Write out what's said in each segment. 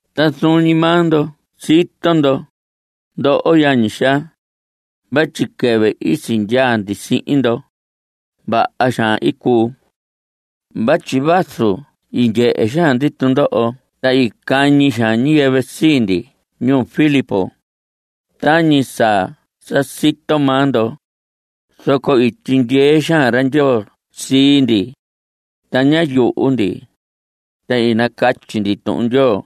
Ta zuun ñi maa ndo sito ndo, ndoho yañi xaa, vatyi quɨvɨ i sindyaa ndi sihin ndo, vaha xaan i cuu. Vatyi vazu i ndyehe xaan ndi tundoho ta i cañi xaan ñiyɨvɨ sii ndi ñuu Filipos, tañi sa sa sito maa ndo, zoco i tyindyee xaan ra Ndyoo sii ndi, ta ñá yuhu ndi, ta i nacatyi ndi Tuhun Ndyoo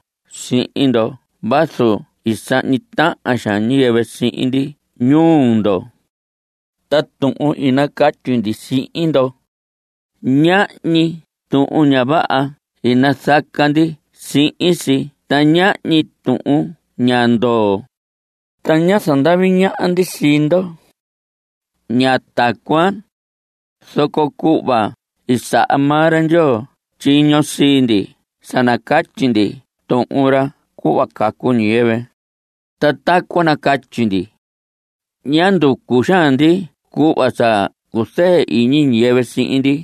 sihin ndo vazu i sahñi tahan xaan ñiyɨvɨ sihin ndi ñuu ndo. Ta tuhun i nacatyi ndi sihin ndo, ñahñi tuhun ña vaha i nazaca ndi sihin si ta ñahñi tuhun ña ndoo. Ta ñá zandavi ñaha ndi sii ndo. Ña tacuan, zoco cuhva i saha maa ra Ndyoo tyiño sii ndi sa nacatyi ndi Tuhun ra cuhva cacu ñiyɨvɨ, ta tacuan nacatyi ndi. Ña nducu xaan ndi cuhva sa cua cuzɨɨ iñi ñiyɨvɨ sihin ndi.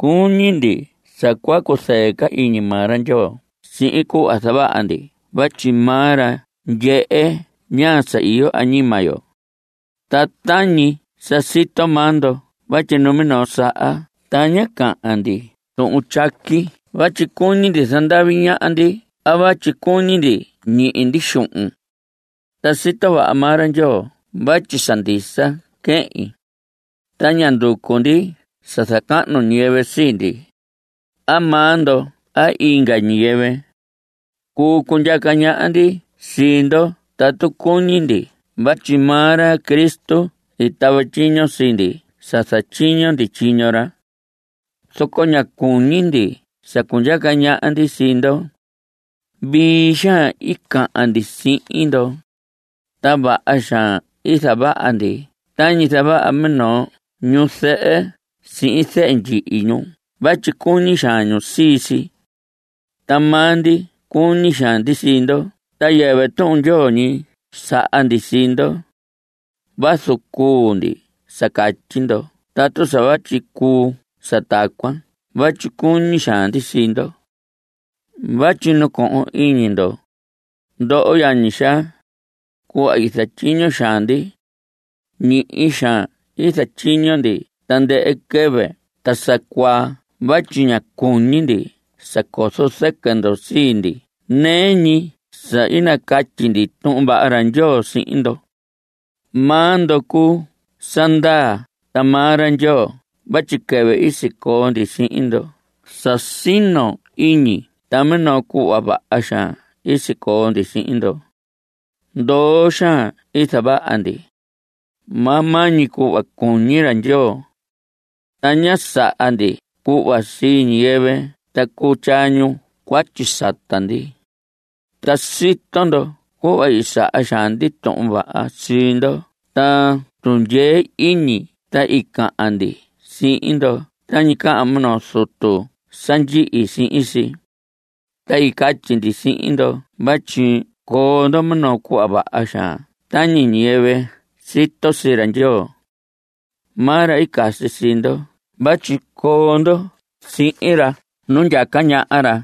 Cuñi ndi sa cua cuzɨɨ iñi maa ra Ndyoo sihin cuhva zavaha ndi vatyi maa ra ndyehe ñaa sa iyo añima yo. Ta tañi sa sito maa ndo vatyi numinoo saha ta ña cahan ndi tuhun tyaqui vatyi cuñi ndi zandavi ñaha ndi a vatyi cuñi ndi ñihi ndi xuhun. Ta sito vaha maa ra Ndyoo vatyi sa ndisa quehin. Ta ña nducu ndi sa zacahnu ñiyɨvɨ sii ndi, a maa ndo a inga ñiyɨvɨ. Cuu cundyaca ñaha ndi sii ndo tatu cuñi ndi vatyi maa ra Cristo i tava tyiño sii ndi sa zatyiño ndi tyiño ra. Zoco ña cuñi ndi sa cundyaca ñaha ndi sii ndo. Vii xaan i cahan ndi sihin ndo, ta vaha xaan i zavaha ndi tañi zavaha minoo ñuzɨhɨ sihin zehe ndyihi ñu vatyi cuñi xaan ñu sii si. Ta maa ndi cuñi xaan ndi sii ndo ta yɨvɨ Tuhun Ndyoo ñi saha ndi sii ndo. Vazu cuu ndi sa catyi ndo tatu sa vatyi cuu sa tacuan vatyi cuñi xaan ndi sii ndo. Vatyi nacohon iñi ndo, ndoho yañi xaa, cuhva i zatyiño xaan ndi. Ñihi xaan i zatyiño ndi tandɨhɨ quɨvɨ ta sa cuaa vatyi ñá cuñi ndi sa cozo zɨquɨ ndo sii ndi nɨɨ ñi sa i nacatyi ndi Tuhun Vaha ra Ndyoo sihin ndo. Maa ndo cuu sa ndaa ta maa ra Ndyoo vatyi quɨvɨ i sicoo ndi sihin ndoho sa sino iñi ta minoo cuhva vaha xaan i sicoo ndi sihin ndo. Ndoo xaan i zavaha ndi, maa maa ñi cuhva cuñi ra Ndyoo. Ta ñá saha ndi cuhva sii ñiyɨvɨ ta cuu tyaa ñu cuatyi sata ndi. Ta sito ndo cuhva i saha xaan ndi tuhun vaha sii ndo ta tundyee iñi ta i cahan ndi sihin ndo tañi cahan minoo zutu sa ndyihi sihin si. Ta i catyi ndi sihin ndo vatyi coo ndo minoo cuhva vaha xaan tañi ñiyɨvɨ sito sii ra Ndyoo. Maa ra i casi sii ndo vatyi coo ndo sihin ra nu ndyaca ñaha ra,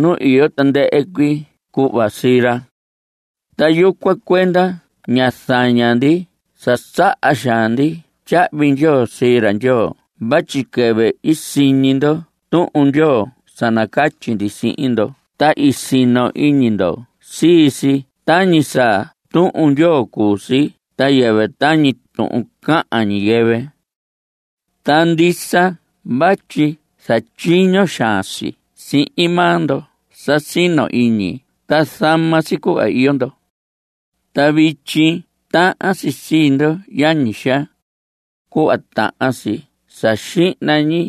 nu iyo tandɨhɨ cuii cuhva sii ra. Ta yucuan cuenda ña zaña ndi sa saha xaan ndi tyahvi ndyoo sii ra Ndyoo vatyi quɨvɨ i siñi ndo Tuhun Ndyoo sa nacatyi ndi sihin ndo ta i sino iñi ndo sii si tañi sa Tuhun Ndyoo cuu si ta yɨvɨ tañi tuhun cahan ñiyɨvɨ. Ta ndisa vatyi zatyiño xaan si sihin maa ndo sa sino iñi ta zama si cuhva iyo ndo. Ta vityi tahan si sii ndo, yañi xaa, cuhva tahan si sa xihna ñi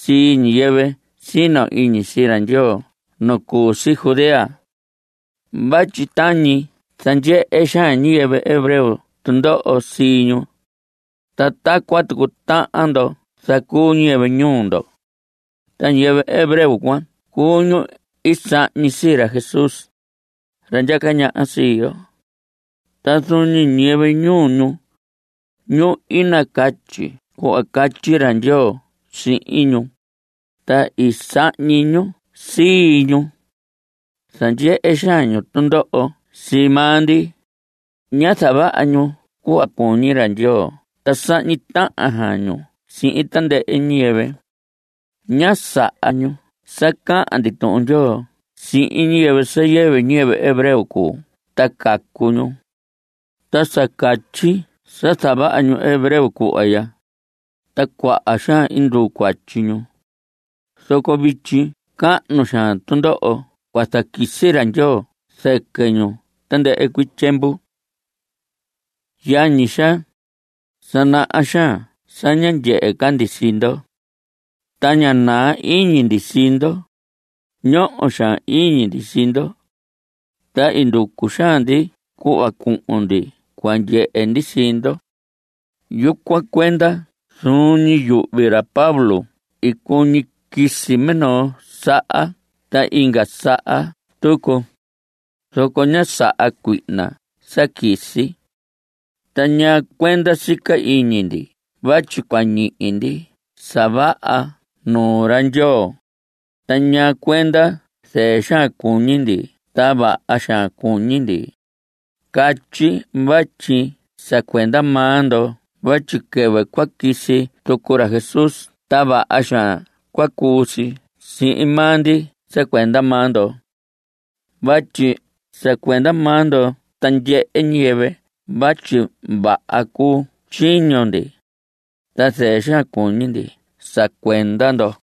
sii ñiyɨvɨ sino iñi sii ra Ndyoo nu cu si Judea. Vatyi tañi zandyehe xaan ñiyɨvɨ hebreo tundoho sii ñu, ta tacuan tucu tahan ndo zacuu ñiyɨvɨ ñuu ndo. Ta ñiyɨvɨ hebreo cuan cuu ñu i sahñi sii ra Jesús, ra ndyaca ñaha sii yo. Ta zuun ñi ñiyɨvɨ ñuu ñu, ñu i nacatyi cuhva catyi ra Ndyoo sihin ñu, ta i sahñi ñu sii ñu. Zandyehe xaan ñu tundoho sii maa ndi. Ña zavaha ñu cuhva cuñi ra Ndyoo ta sahñi tahan xaan ñu sihin tandɨhɨ ñiyɨvɨ. Ña saha ñu sa cahan ndi Tuhun Ndyoo sihin ñiyɨvɨ sa yɨvɨ ñiyɨvɨ hebreo cuu ta cacu ñu. Ta sa catyi sa zavaha ñu hebreo cuhva ya, ta cuaha xaan nduu cuatyi ñu. Zoco vityi cahnu xaan tundoho cua zaquisi ra Ndyoo zɨquɨ ñu tandɨhɨ cuii tyiemvu. Yañi xaa, sa naha xaan sa ña ndyehe ca ndi sii ndo. Ta ña naa iñi ndi sii ndo. Ñoho xaan iñi ndi sii ndo. Ta i nducu xaan ndi cuhva cuhun ndi cua ndyehe ndi sii ndo. Yucuan cuenda zuun ñi yuhvi ra Pablo i cuñi quisi minoo saha ta inga saha tucu, zoco ñá saha cuihna sa quisi. ¿Ta ñaa cuenda sica iñi ndi vatyi cua ñihi ndi sa vaha nuu ra Ndyoo? ¿Ta ñaa cuenda zɨɨ xaan cuñi ndi ta vaha xaan cuñi ndi? Catyi vatyi sa cuenda maa ndo vatyi quɨvɨ cua quisi tucu ra Jesús ta vaha xaan cua cuu si sihin maa ndi sa cuenda maa ndo. Vatyi sa cuenda maa ndo ta ndyehe ñiyɨvɨ vatyi vaha cuu tyiño ndi, ta zɨɨ xaan cuñi ndi sa cuenda ndo.